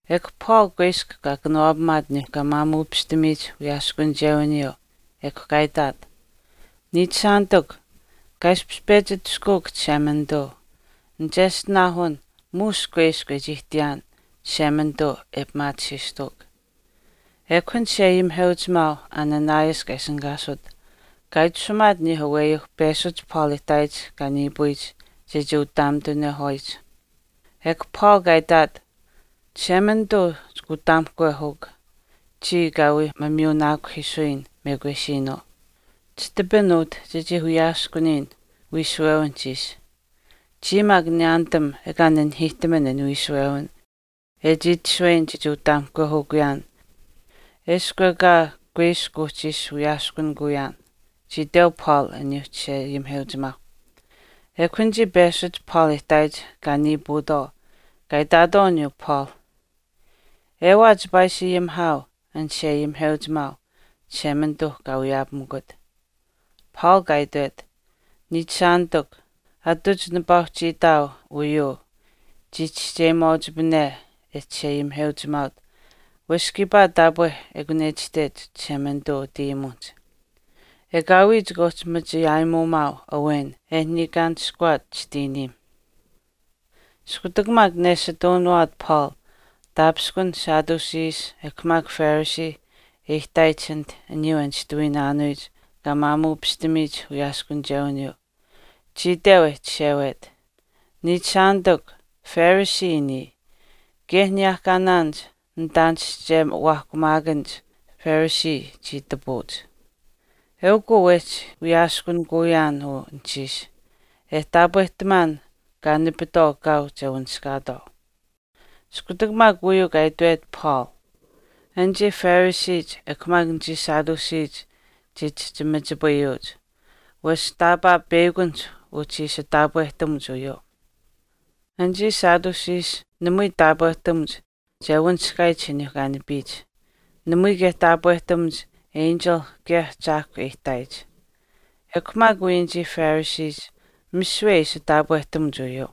Ekw Paul kuiskw kaa kanawaapamaat aniyuu kaa maamuupishtamiyich wiyaaskunichewiniyuu ekw kaa itaat, “Niichishaanitikw, kaa ishpish pechi atushkuuk Chishemanituu nicheshtinaahun muush kuiskw e chii ihtiyaan Chishemanituu e pimaatisiistuuk.” Ekw an chisheayimiheuchimaau Ananias kaa ishinihkaasut kaa itashumaat aniyuuh aweyuu peshuch Paul e ihtaayich kaa niipuyich chechii utaamitunehwaayich. Ekw Paul kaa itaat, “Chishemanituu chika utaamihkwehuukw, chiya kaa wii mamiyuunaakuhiisuyin mekwesiinuu. Chitapin utah chechii wiyaskuniyin wiishuwewinihch ishi, chiya maak niyaanitam ekaa nanihiihtaman an wiishuwewin e chii itashuweyin chechii utaamihkwehukuyaan eshkw maak ekaa kuiskw uhchi ishi wiyaaskunikuyaan,” chii iteu Paul aniyuu chisheayimiheuchimaau. Ekw anichii peshuch Paul e ihtaayich kaa niipuutwaau kaa itaatwaau aniyuu Paul, “Ewaa chipaa ishi ayimihaau an chisheayimiheuchimaau Chishemanituu kaa wiyaapamikut.” Paul kaa itwet, “Niichishaanitikw, atuch nipaa uhchii itaau uyuu chii chischeyimaauchipane e chisheayimiheuchimaaut wesh kiipaa taapwe ekun e itashtech Chishemanituu utayimuwinihch, Ekaawii chika uhchi machi aayimuumaau awen e niikaanishkuwaat chitiiniim.” Iskutak maak neshitaunuwaat Paul taapishkun Sadduceeh ekw maak Pharisee e ihtaayich anit aniyuu e nishtuwiyich kaa maamuupishtamiyich wiyaaskunichewiniyuu, chii iteu e chishewet, “Niichishaanitikw, Pharisee niya, kaye aniyehkaanaanich nitaanischewaahkumaakanich Pharisee chii itapuuch. Eukw uu wehchi wiyaaskunikuyaan uu anuhchiish, e taapwehtamaan kaa nipitwaau kaau che wanishkaatwaau.” Iskutak maak uyuu kaa itwet Paul, anichii Phariseech ekw maak anichii Sadduceech chii chihchi machipayuuch, wesh taapaa peyakunihch uhchi ishi taapwehtamuch uyuu. Anichii Sadduceech namui taapwehtamuch che wanishkaayich aniyuu kaa nipiyich. Namui kaye taapwehtamuch enchil kaye ahchaahkwa e ihtaayich. Ekw maak wii anichii Phariseech misiwe ishi taapwehtamuch uyuu.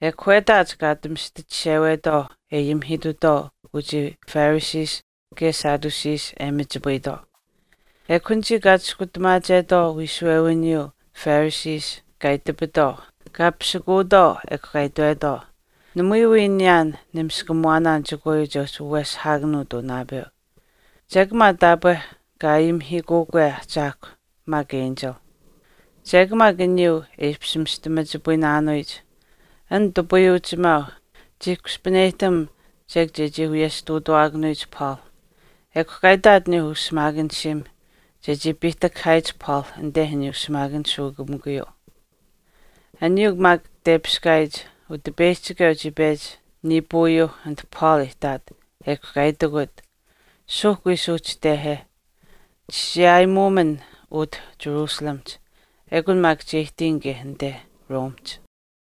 Ekw wetaach kaa ati mista chishewetwaau e ayimihiitutwaau uchii Phariseech kaye Sadduceech e machipayitwaau. Ekw anichii kaa chiskutamaachetwaau wiishuwewiniyuu Pharisee kaa itapitwaau kaa pisikuutwaau ekw kaa itwetwaau, “Namui wii niyaan nimiskamuwaanaan chekwaayuu che uhchi waweshihaakanuut uu naapeu. Chek maa taapwe kaa ayimihiikuukwe ahchaahkwa maak enchil.” Chek maak aniyuu e ishpish mista machipayinaanuyich, an nitupayuuchimaau chii kushpaneyihtam chek chechii wiyesh ihtuutawaakanuyich Paul. Ekw kaa itaat aniyuu ushimaakanishiim chechii piihtakahaayich Paul anite aniyuu shimaakanishuukamikuhch. Aniyuu maak tepiskaayich, Utipeyihchikeu chii pechi niipuuyuuh anit Paul e itaat ekw kaa itikut, “Suuhk wii suuhchitehe, chichii aayimuumin utah Jerusalemihch, ekun maak che ihtiyin kaye anite Romehch.”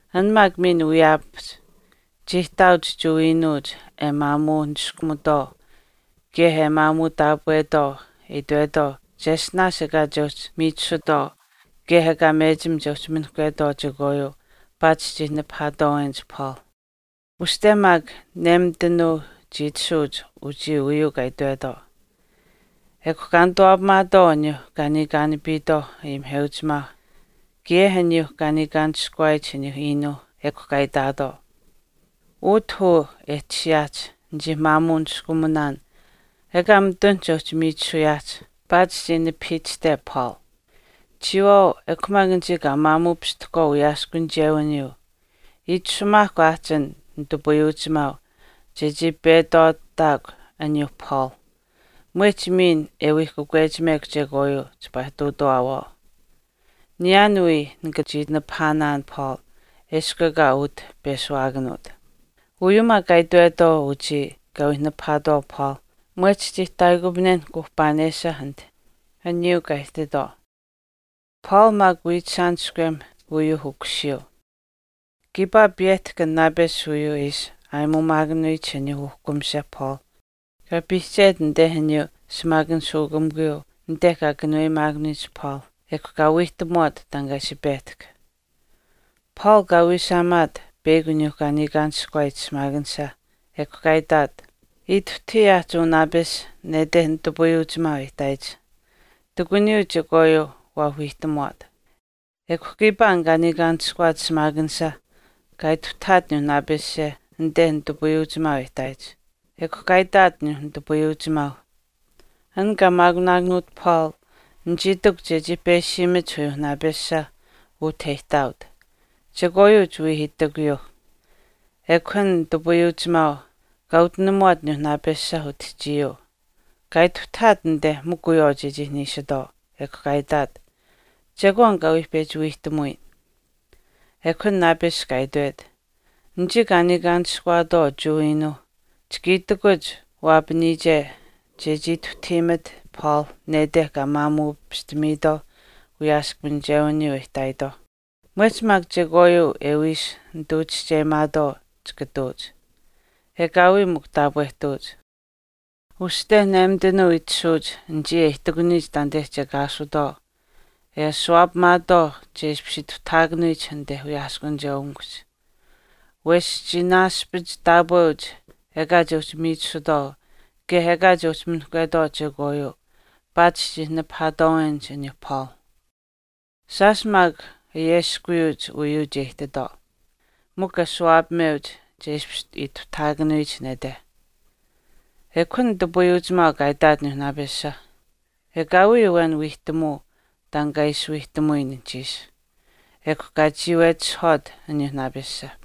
An maak miin wiyaapahch chii ihtaauch Jewa iinuuch e maamuu niskumutwaau kaye e maamuu taapwetwaau e itwetwaau cheshtinaash ekaa che uhchi miichisutwaau kaye ekaa mechim che minihkwetwaau chekwaayuu paatish chii nipahaatwaawenich Paul. Uste maak nemitanuu chii tashuuch uchii uyuu kaa itwetwaau. Ekw kaa nituwaapamaatwaau aniyuu kaa niikaanapiitwaau ayimiheuchimaauh kaye aniyuu kaa niikaanishkuwaayich aniyuuh iinuuh ekw kaa itaatwaau, “Utah uu e tashiyaahch nichii maamuu niskumunaan ekaa mitun che uhchi miichisuyaahch paatish chii nipahiichishte Paul. Chiyawaau ekw maak anichii kaa maamuupishtahkwaau wiyaaskunichewiniyuu, itashumaahkw aahch an nitupayuuchimaau chechii petwaataakw aniyuu Paul, mwehch miin e wii kakwechimekw chekwaayuu chipaa ihtuutawaawaau. Niyaan wii nika chii nipahaanaan Paul eshkw ekaa utah peshuwaakanuut.” Uyuu maak kaa itwetwaau uchii kaa wii nipahaatwaau Paul mwehch chii ihtaayikupanen kuuhpaanesha anit aniyuu kaa ihtaatwaau. Paul maak wiichishaaniskwem uyuu ukusiyuu. Kiipaa piyehtahk an naapesh uyuu e ishi aayimuumaakanuyich aniyuu uhkumis Paul. Kaa piihchet anite aniyuu shimaakanishuukamikuyuu anite kaa kanuweyimaakanuyich Paul, ekw kaa wiihtamuwaat taan kaa ishi pehtahk. Paul kaa wiishaamaat peyakw aniyuu kaa niikaanishkuwaayich shimaakanisha, ekw kaa itaat, ‘Ituhtahii aahch uu naapesh nete nitupayuuchimaau e ihtaayich. Ihtakuniyuu chekwaayuu waa wiihtamuwaat.” Ekw kiipaa an kaa niikaanishkuwaat shimaakanisha kaa ituhtahaat aniyuu naapesha anite nitupayuuchimaau e ihtaayich, ekw kaa itaat aniyuu nitupayuuchimaau, “An kaa maakunaakanuut Paul nichii itikw chechii peshiimach uyuu naapesh utah e ihtaaut, chekwaayuu chiwii itikuyuuh.” Ekw an nitupayuuchimaau kaa utinamuwaat aniyuu naapesha utihchiyuu, kaa ituhtahaat anite mikw wiyawaau chechii niishitwaau, ekw kaa itaat, “Chekwaan kaa wii pechi wiihtamuyin.” Ekw an naapesh kaa itwet, “Anichii kaa niikaanishkuwaatwaau Jewa iinuuh chika itikuch waapaniyiche chechii ituhtahiimekw Paul nete kaa maamuupishtamiitwaau wiyaaskunichewiniyuu e ihtaayitwaauh, mwehch miin chekwaayuu e wii ishi nituu chischeyimaatwaau chika ihtuuch. Ekaawii mikw taapwehtuuch. Uste nemitanuu itashuuch anichii e ihtakuniyich taanite kiyaashutwaau e ashuwaapamaatwaau che ishpish ituhtahaakanuyich anite wiyaaskunicheukamikuhch. Wesh chii naaspich taapweuch ekaa che uhchi miichisutwaau kaye ekaa che uhchi minihkwetwaau chekwaayuu paatish chii nipahaatwaawenich aniyuu Paul. Shaash maak ayeskuwiyuuch uyuu che ihtitwaau, mikw ashuwaapameuch che ishpish ituhtahaakanuyich nete.” Ekw an nitupayuuchimaau kaa itaat aniyuu naapesha, “Ekaawii awen wiihtamuu taan kaa ishi wiihtamuyin anuhchiish.” Ekw kaa chiiwetishihwaat aniyuu naapesha.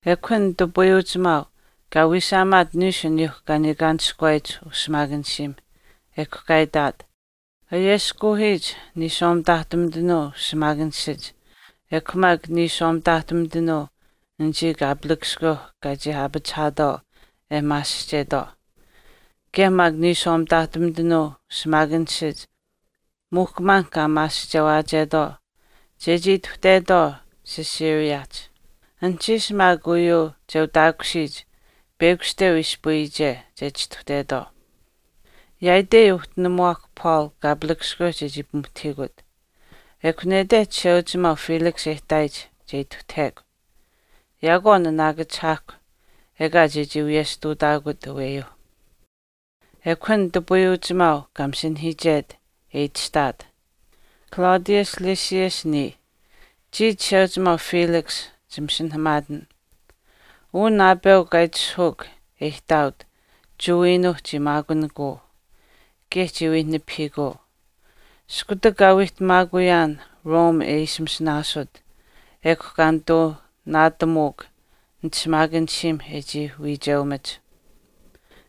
Ekw an nitupayuuchimaau kaa wiishaamaat niishu aniyuu kaa niikaanishkuwaayich ushimaakanishiim, ekw kaa itaat, “Ayeskuuhiich niishwaa mitaahtumitanuu shimaakanishach ekw maak niishwaashumitanuu anichii kaapalakaskweu kaa chii aapachihaatwaau e maasihchetwaau kaye maak niishwaa mitaahtumitanuu shimaakanishach muuhkumaan kaa maasihchewaachetwaau chechii ituhtetwaau Caesareahch. Anuhchiish maak uyuu che utaakushiyich peyakushteu ispayiyiche che chistuhtetwaau. Yaaitei uhtinimuwaakw Paul kaapalakaskweu chechii pimuhtahiikut. Ekw nete chisheuchimaau Felix e ihtaayich che ituhtahekw. Yaakwaau naanaakachihaahkw ekaa chechii wiyesh ihtuutaakut aweyuu.” Ekw an nitupayuuchimaau kaa masinahiichet e itashtaat, “Claudius Lysias niya, chii chisheuchimaau Felix chimasinahamaatin, Uu naapeu kaa itishahuuk e ihtaaut Jewa iinuuh chii maakunikuu, kaye chii wii nipahiikuu. Iskutak kaa wiihtamaakuyaan Rome e ishi masinaasut, ekw kaa nituu naatamuuk nitishimaakanishiim e chii wiicheumach.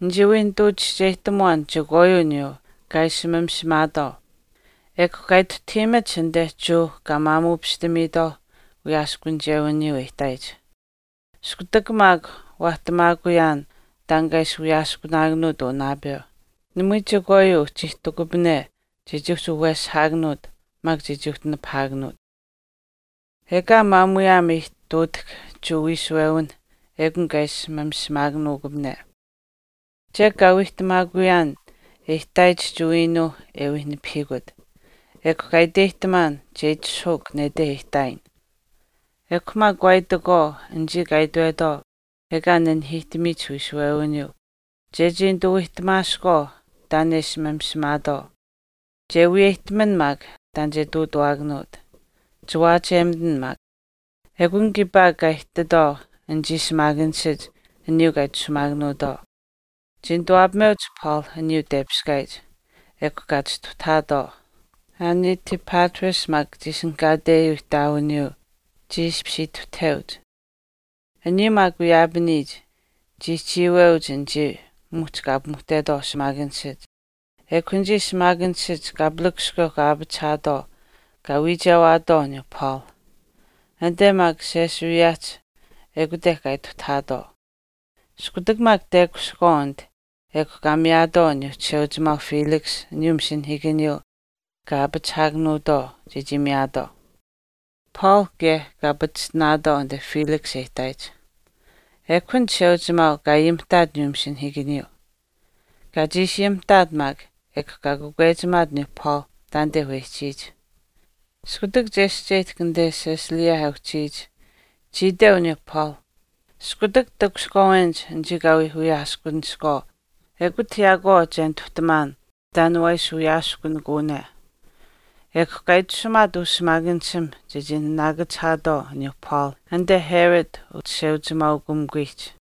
Nichii wii nituu chischeyihtamuwaan chekwaayuu aniyuu kaa ishi mamishimaatwaau, ekw kaa ituhtahiimach anite Jewa kaa maamuupishtamiyich wiyaaskunichewiniyuu e ihtaayich. Iskutak maak waahtamaakuyaan taan kaa ishi wiyaaskunaakanuut uu naapeu namui chekwaayuu uhchi ihtikupane chechii uhchi waweshihaakanuut maak chechii uhchi nipahaakanuut. Ekaa maamuyaam aihtuutahk Jewa wiishuwewinh ekun kaa ishi mamishimaakanuukupane. Chek kaa wiihtamaakuyaan e ihtaayich Jewa iinuuh e wii nipahiikut, ekw kaa iteyihtamaan chechii itishahuuk nete e ihtaayin. Ekw maak waa itakwaau anichii kaa itwetwaau ekaa nanihiihtamiyich wiishuwewiniyuu, chechii nituu wiihtamaaskwaau taan e ishi mamishimaatwaau. Che wiyeyihtaman maak taan che ihtuutuwaakanuut. Chiwaachiyemitin maak.” Ekun kiipaa kaa ihtitwaau anichii shimaakanishach aniyuu kaa itashumaakanuutwaau. Chii nituwaapameuch Paul aniyuu tepiskaayich, ekw kaa chistuhtahaatwaau. Anitipatris maak kaa ishinihkaateyich ihtaawiniyuu chii ishpish ituhtaheuch. Aniyuu maak wiyaapaniyich, chii chiiweuch anichii muhch kaa pimuhtetwaau shimaakanishach. Ekw anichii shimaakanishach kaapalakaskweu kaa aapachihaatwaau kaa wiichewaatwaau aniyuu Paul. Anite maak Caesareahch ekute kaa ituhtahaatwaau. Iskutak maak tekushihkwaau anit ekw kaa miyaatwaau aniyuu chisheuchimaau Felix aniyuu masinahiikaniyuu kaa aapachihaakanuutwaau chechii miyaatwaau. Paul kaye kaa pachishtinaatwaau anite Felix e ihtaayich. Ekw an chisheuchimaau kaa ayimihtaat aniyuu masinahiikaniyuu. Kaa chiishi ayimihtaat maak ekw kaa kakwechimaat aniyuu Paul taanite wehchiyich. Iskutak chescheyihtahk anite Cilicia e uhchiyich, chii iteu aniyuu Paul, “Iskutak takushihkwaawenich anichii kaa wii wiyaaskuniskwaau ekut yaakwaau che nituhtamaan taan waa ishi wiyaaskunikuwane.” Ekw kaa itashumaat ushimaakanishiim chechii naanaakachihaatwaau aniyuu Paul anite Herod uchisheuchimaaukamikuyich.